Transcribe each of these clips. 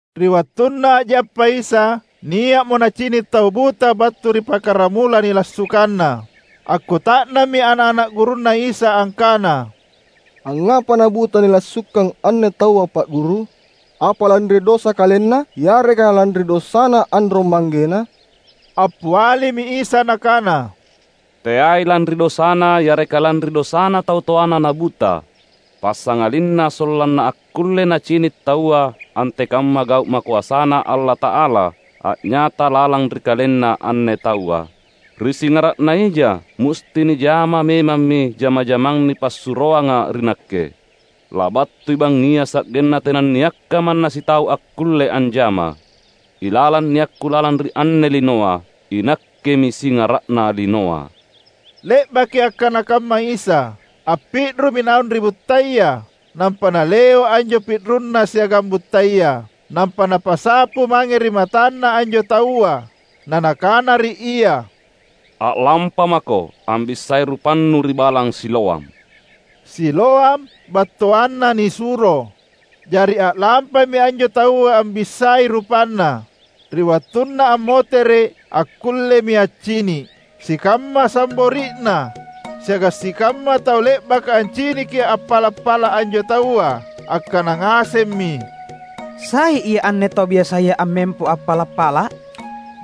Ri wattunna a’jappa Isa, nia’mo Nacini’ tau buta battu ri pakaramula nilassukanna. Akkuta’nammi ana’-ana’ gurunNa Isa angkana, "Angngapa nabuta nilassukang anne taua Pa’ Guru? Apa lanri dosa kalenna yareka lanri dosana anrong-manggena?" Appialimi Isa Nakana, "Teai lanri dosana yareka lanri dosana tau toana nabuta, passangalinna sollanna akkulle nacini’ taua antekamma gau’ makoasaNa Allata’ala a’nyata lalang ri kalenna anne taua. Ri singara’na ija musti nijama memammi jama-jamang nipassuroanga ri Nakke. Labattui bangngia sa’genna tenanniakka manna sitau akkulle anjama. Ilalang niakKu lalang ri anne linoa, iNakkemi Singara’na linoa." Le’baki akkana kamma Isa, appi’rumi naung ri buttaya, nampa Naleo’ anjo pi’runNa siagang buttaya. Nampa Napasapu mange ri matanna anjo taua, na Nakana ri ia, "A’lampamako ambissai rupannu ri Balang Siloam." (Siloam battuanna ‘Nisuro’.) Jari a’lampami anjo taua ambissai rupanna. Ri wattunna ammotere’, akkullemi accini’. Sikamma sambori’na, siagang sikamma tau le’baka anciniki appala’-pala’ anjo taua, angkana ngasemmi, "Sai ia anne tau biasaya ammempo appala’-pala’?"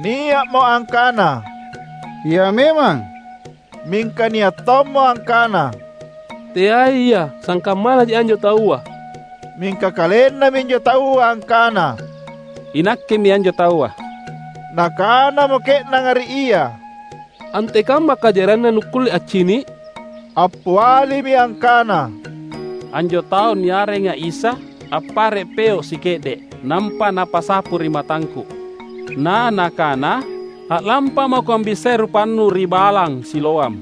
Nia’mo angkana, "Ia memang." Mingka nia’ tommo angkana, "Teai ia, sangkammanaji anjo taua." Mingka kalenna minjo taua angkana, "Inakkemi anjo taua." Nakanamo ke’nanga ri ia, "Antekamma kajarianna nukkulle accini’?" Appialimi angkana, "Anjo tau niarenga Isa appare’ peo’ sike’de’, nampa Napasapu ri matangku, na Nakana, ‘A’lampamako ambissai rupannu ri Balang Siloam.’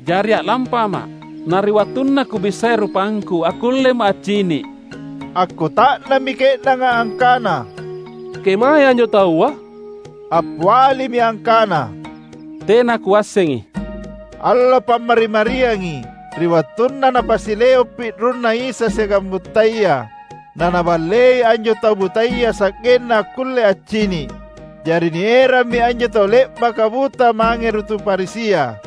Jari a’lampama’. Na ri wattunna kubissai rupangku, akkullema’ accini’." Akkuta’nammi ke’nanga angkana, "Kemae anjo taua?" Appialimi angkana, "Tena kuassengi." Allo Pammari-mariangi ri wattunna Napasileo’ pi’runNa Isa siagang buttaya naNaballei anjo tau butaya sa’genna akkulle accini’. Jari nierammi anjo tau le’baka buta mange ri tu Farisia.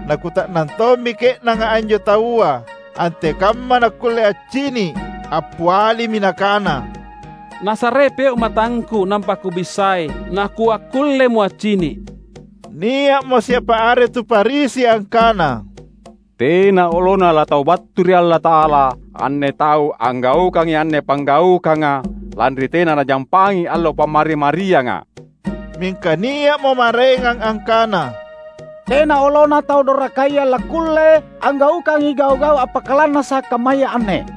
Nakuta’nang tommi ke’nanga anjo taua, antekamma nakkulle accini’. Appialimi nakana, "Nasarei peo’ matangku nampa kubissai nakuakkullemo accini’." Nia’mo siapa are tu Farisi angkana, "Tena olona laTau battu ri Allata’ala anne Tau anggaukangai anne panggaukanga lanri tena Najampangi allo Pammari-marianga." Mingka nia’mo maraengang angkana, "Tena olona Tau dorakaya lakkulle anggaukangi gau’-gau’ appakalannasa’ kammaya anne!"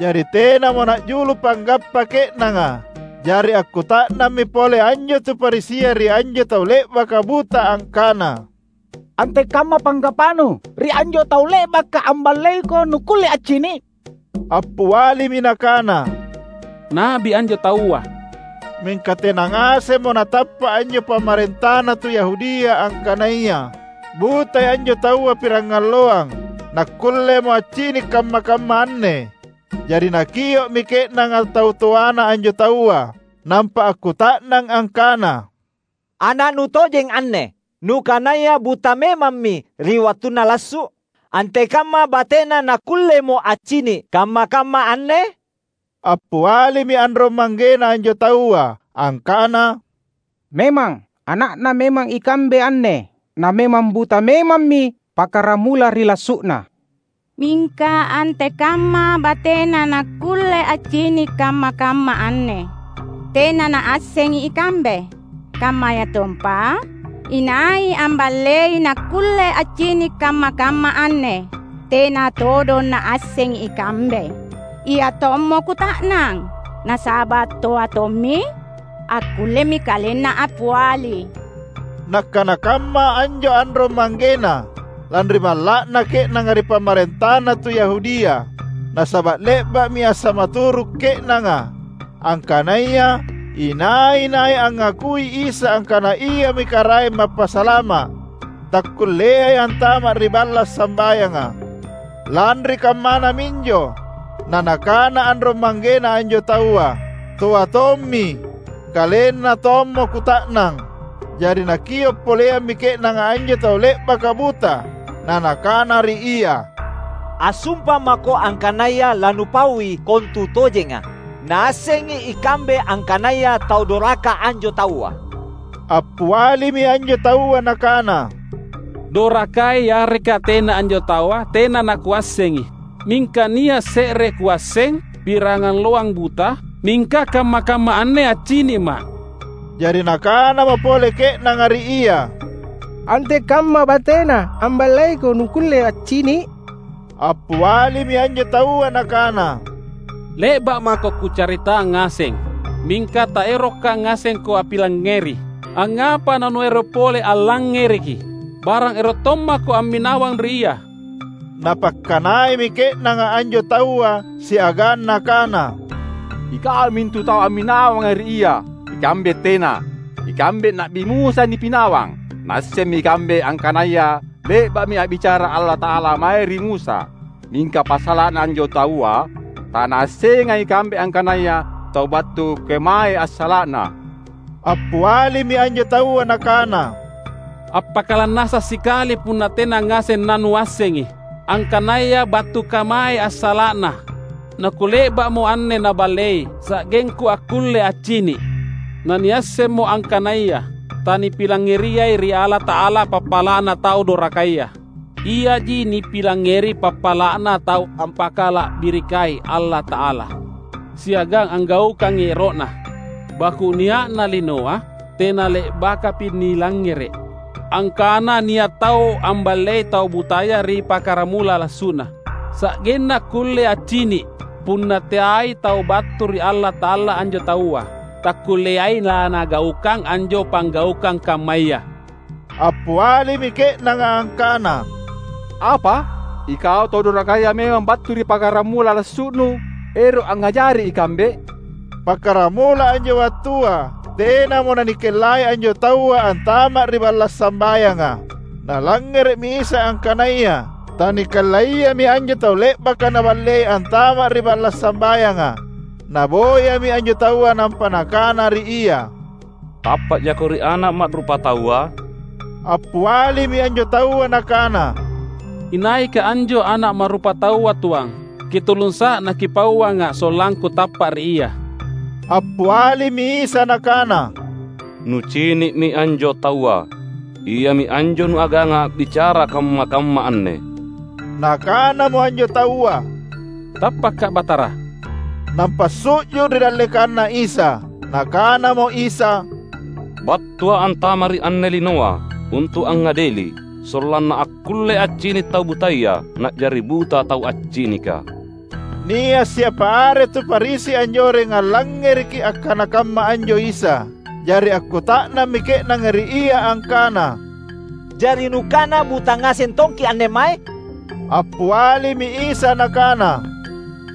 Jari tenamo na’julu panggappa ke’nanga. Jari akkuta’nammi pole anjo tu Farisia ri anjo tau le’baka buta angkana, "Antekamma panggappanu ri anjo Tau le’baka amballeiko nukkulle accini’?" Appialimi nakana, "Na’bi anjo Taua." Mingka tena ngasemmo natappa’ anjo pamarentana tu Yahudia angkanaya butai anjo taua pirangalloang nakkullemo accini’ kamma-kamma anne. Jari nakio’mi ke’nanga tau toana anjo taua; nampa akkuta’nang angkana, "Ana’nu tojeng anne, nukanaya buta memammi ri wattunna lassu’? Antekamma batena nakkullemo accini’ kamma-kamma anne?" Appialimi anrong-manggena anjo taua angkana, "Memang, ana’na memang ikambe anne; na memang buta memammi pakkaramula ri lassu’na. Mingka antekamma batena nakkulle accini’ kamma-kamma anne, tena naassengi ikambe. Kammayatompa, inai amballei nakkulle accini’ kamma-kamma anne, tena todong naassengi ikambe. Ia tommo kuta’nang, nasaba’ toa tommi; akkullemi kalenna appiali." Nakkana kamma anjo anrong-manggena, lanri malla’na ke’nanga ri pamarentana tu Yahudia; nasaba’ le’ba’mi assamaturu’ ke’nanga, angkanaya inai-nai angngakui Isa angkana Iami Karaeng Mappasalama’, takkulleai antama’ ri balla’ sambayanga. Lanri kammana minjo na nakana anrong-manggena anjo taua, "Toa tommi; kalenna tommo kuta’nang." Jari nakio’ poleammi ke’nanga anjo tau le’baka buta, na nakana ri ia, "Assumpa mako angkanaya lanupaui kontutojenga. Naassengi ikambe angkanaya tau doraka anjo Taua." Appialimi anjo taua nakana, "Dorakai yareka tena anjo Taua, tena nakuassengi. Mingka nia’ se’re kuasseng; pirangalloang buta’, mingka kamma-kamma anne accini’ma’." Jari nakanamo pole ke’nanga ri ia, "Antekamma bateNa amballeiko nukkulle accini’?" Appialimi anjo taua nakana, "Le’ba’ mako kucaritang ngaseng, mingka taeroka ngasengko appilangngeri. Angngapa nanuero’ pole allangngereki? Barang ero’ tommako amminawang ri Ia?" Napakkanaimi ke’nanga anjo taua siagang nakana, "Ikau mintu tau amminawanga ri Ia; ikambe tena! Ikambe Na’bi Musa nipinawang. Naassemmi ikambe angkanaya le’ba’mi a’bicara Allata’ala mae ri Musa. Mingka passala’na anjo taua, tanaassengai ikambe angkanaya tau battu kemae assala’Na." Appialimi anjo taua nakana, "Appakalannasa’ sikali punna tena ngaseng nanuassengi angkanaya battu kemae assala’Na, nakule’ba’mo anne Naballei sa’gengku akkulle accini’. Naniassemmo angkanaya tanipilangngeriai ri Allata’ala pappala’na tau dorakaya; iaji nipilangngeri pappala’na tau ampakala’birikai Allata’ala, siagang anggaukangai ero’Na. Baku’ nia’na linoa tenale’bakapi nilangngere’ angkana nia’ tau amballei tau butaya ri pakkaramula lassu’na sa’genna akkulle accini’. Punna teai tau battu ri Allata’ala anjo taua, takkulleai laNagaukang anjo panggaukang kammaya." Appialimi ke’nanga angkana, "Apa? Ikau tau dorakaya memang battu ri pakkaramula lassu’nu ero’ angngajaraki ikambe?" Pakkaramula anjo wattua tenamo nanikellai anjo taua antama’ ri balla’ sambayanga. Nalangngere’mi Isa angkanaya tanikellaiami anjo tau le’baka Naballei antama’ ri balla’ sambayanga. Naboyami anjo taua nampa Nakana ri ia, "Tappa’jako ri Ana’ Ma’rupataua?" Appialimi anjo taua nakana, "Inaika anjo Ana’ Ma’rupataua, Tuang? Kitulungsa’ naKipauanga’ sollangku tappa’ ri Ia." Appialimi Isa Nakana, "Nucini’mi anjo taua. Iami anjo nuaganga a’bicara kamma-kamma anne." Nakanamo anjo taua, "Tappaka’ Batara," nampa su’ju’ ri dallekanNa Isa. Nakanamo Isa, "BattuA’ antama’ ri anne linoa untu’ angngadeli; sollanna akkulle accini’ tau butaya, na’jari buta tau accinika." Nia’ siapa are tu Farisi anjoreng allangngereki akkana kamma anjo Isa; jari akkuta’nammi ke’nanga ri Ia angkana, "Jari Nukana buta ngaseng tongki’ anne mae?" Appialimi Isa Nakana,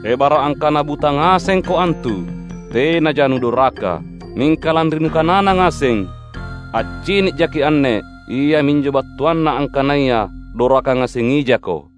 "Ebara’ angkana buta ngasengko antu, tenaja nudoraka. Mingka lanri nukanana ngaseng, ‘Accini’jaki’ anne’, iaminjo battuanna angkanaya doraka ngasengijako."